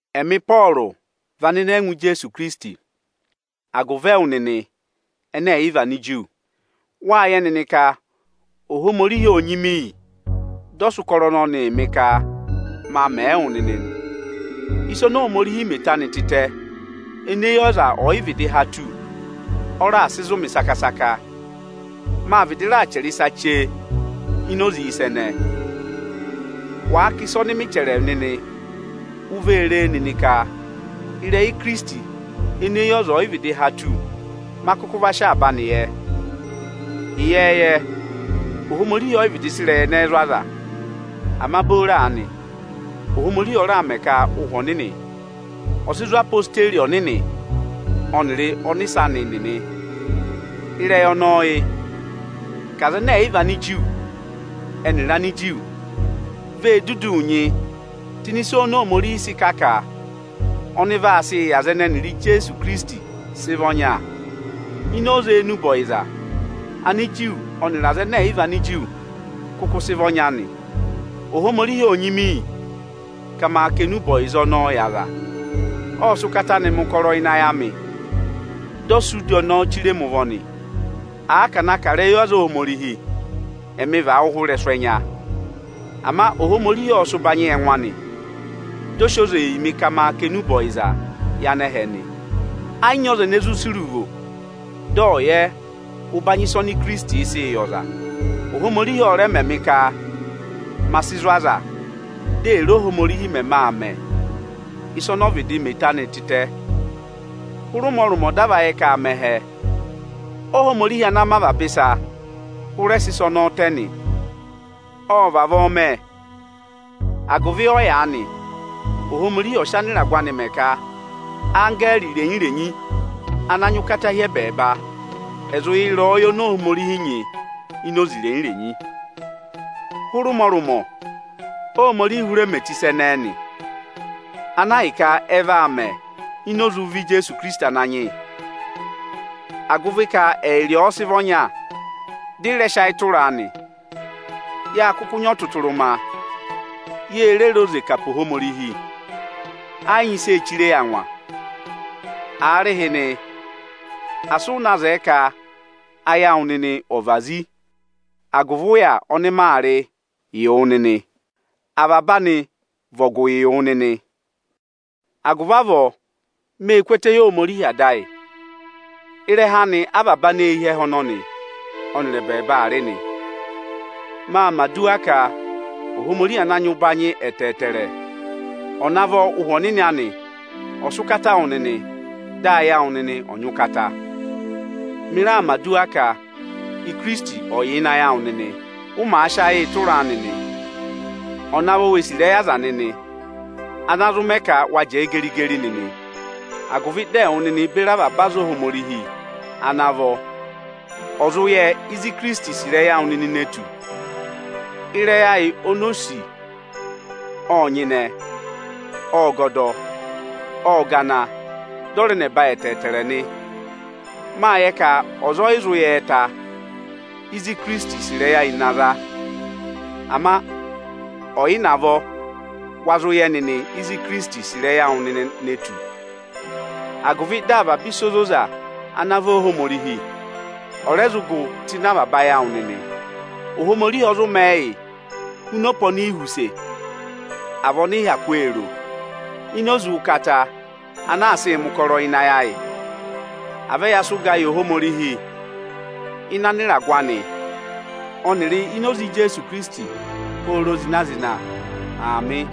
Ẹmị Ịpọọrụ vị anịnẹngwa Ijeesu Ikirisiti agụvị ẹwụ nịnị ẹnẹ ẹ̀ yị vị Aniju. Wáa yẹ nịnị ka Ohomorihi óo nyị mị iyi dị ọ sị ụkọrọ ọnọnịị mị ka maa mẹẹ wụ nịnị nị. Ịsa oni Ohomorihi mẹ eto anị tịtẹ ene eyi ọza ọ̀ yị vịdị há tù, ọ raà sị zụ̀ mị saka-saka. Mâ vịdị raà chẹrẹ ịsa chee ini oze ịsa ẹnẹẹ. Wàa kà ịsa ọnị mị chẹrẹ nịnị, u vee ree nịnị ka ịrẹyị Ikirisiti ene eyi ọza ọ̀ yị vịdị há tù, ma kụkụ va sị avaba anị yẹ. Ịyẹẹyẹ, Ohomorihi ọyị vịdị sị ịrẹyị ẹnẹẹ zụ̀ aza. Ama booro aanị, Ohomorihi ọ raà mẹ ka Ụhwẹ Ọnịnị ọ̀ sị zụ̀ odeyi ọnịnị ọnịrị ọnịsẹ anị nịnị. Ịrẹyị ọnọọ yị: ka Anigiriki, ẹnịrị Aniju vee duduu nyị tụ́ ịnị ịsa oni Ohomorihi sị kà ka ọnị vaa sịị yị aza anị ẹnẹ ẹnịrị Ijeesu Ikirisiti sị vị ọnya. Ini oze enube ọyịza, Aniju ọnịrị Anigiriki kụkụ sị vị ọnya nị. Ohomorihi óo nyị mị iyi, ka maa kà enube ọyịza ọnọọ yị aza. Ộ sị ụkata anị mẹ̀ ụkọrọ ịnị ayị amị, dị ọ sị udi ọnọọ chire mi ụvọ nị. Àa ka à na kà ịrẹyị aza Ohomorihi, ẹmị vị awụhwẹ ị́rẹsụ ẹnya. Ama Ohomorihi ọ sị sị ụbanyị yị ẹngụ anị, dị ọ sị oze yị mị ka ma kà enube ọyịza yị anẹhẹ nị. Ẹ yị nyị ọza ene zụ sì iruvo, dị ọ̀ yẹ ụbanyị ịsa oni Ikirisitiī sịị yị ọza. Ohomorihi ọ rẹ mẹ mị ka ma sị zụ̀ aza, dị è re e Óhomorihi mẹmẹ aa mẹ̀ ịsa ọnị ọ vịdị mẹ eto anị tịtẹ. Hụrị ụmọrụmọ dị a va yẹ ka aa mẹ ẹhẹ, Óhomorihi ana mẹ avaba ịsa hụrẹ sị ịsa ọnọọ tẹ nị. Ộ vavọọ mẹ, agụvị ọyaanị Ohomorihi ọ̀ sị anịragụ anị mẹ ka anggẹẹrị irenyi-irenyi ana nyị ụkata hi ẹbẹẹba ẹ̀ zụ yẹ ịrẹyọyẹ oni Ohomorihi nyị ini oze irenyi-renyi. Hụrị ụmọrụmọ Óhomorihi hụrẹ mẹ eto ịsa ẹnẹẹ nị, ana ahịka ọ va mẹ ini oze ụvọ Ijeesu Ikirisiti Ananyị yị. Agụvị ka ẹyịrị ọ ọ sị vị ọnya, dị ị rẹ sị ayị tụra a nị, ya kụkụ nyị ọtụtụrụma, ye re re oze kà pe Ohomorihi. Ẹ yị nyị ịsị ee chire yi angwa. Aarịhịnị, asị ụ na zẹẹ ka ayị awụ nịnị ọ̀ vazi agụvị ụya ọnị maa rịị yị wụ nịnị! Avaba anị vị ọgụ yị wụ nịnị. Agụvị avọọ, mê ku ẹtẹ yị Ohomorihi Ada ayị. Ịrẹha anị avaba aneehi ẹhẹ ọnọnị ọnịrị ẹbẹẹba aa rị nị. Maa mẹ̀ aduwa ka Ohomorihi ana nyị ụbanyị ẹtẹẹtẹrẹ ọ̀ navọ Ụhwẹ Ọnịnị anị ọ̀ sị ụkata wụ nịnị, dị ayị awụ nịnị ọ̀ nyị ụkata. Mị raa mẹ̀ aduwa ka Ikirisiti ọ̀ yà ịnị ayị awụ nịnị, ụ màa sị ayịị tụraa nịnị. Ọ̀ navọ wee sì ịrẹyị aza nịnị, ana zụ mẹ ka wa jẹẹ geri-geri nịnị, agụvị dị ẹwụ nịnị beri avaba aza Ohomorihi ana vọ, ọ̀ zụ yẹ ịzị Ikirisiti sì ịrẹyị awụ nịnị ne tù. Ịrẹyị ayị oni o sì ọ́ọ nyịnẹ, ọ́ọ gọdọ, ọ́ọ gana, dị ọ rẹ nẹba ẹtẹẹtẹrẹ nị. Máa yẹ ka ọza ọ yị zụ yẹ ta, ịzị Ikirisiti sì ịrẹyị ayị na za. Ama ọ̀ yị navọ wa zụ yẹ nịnị ịzị Ikirisiti sì ịrẹyị awụ nịnị ne tù, agụvị dị avaba ịsa ozoza ana vị Óohomorihi, ọ̀ rẹ zụ gụ tụ́ ịnị avaba ayị awụ nịnị. Ohomorihi ọ zụ mẹẹ yị huna ọpa oni i họ̀ use, à vị ọnị ị hyakụ ee ro, ini oze ụkata ana aa sịị mẹ̀ ụkọrọ ịnị ayị ayị. À vẹ yaa sị ụgaa yị Ohomorihi ịnị ịragụ anị ọnịrị ini oze Ijeesu Ikirisiti pooro zịna-zịna! Aamị.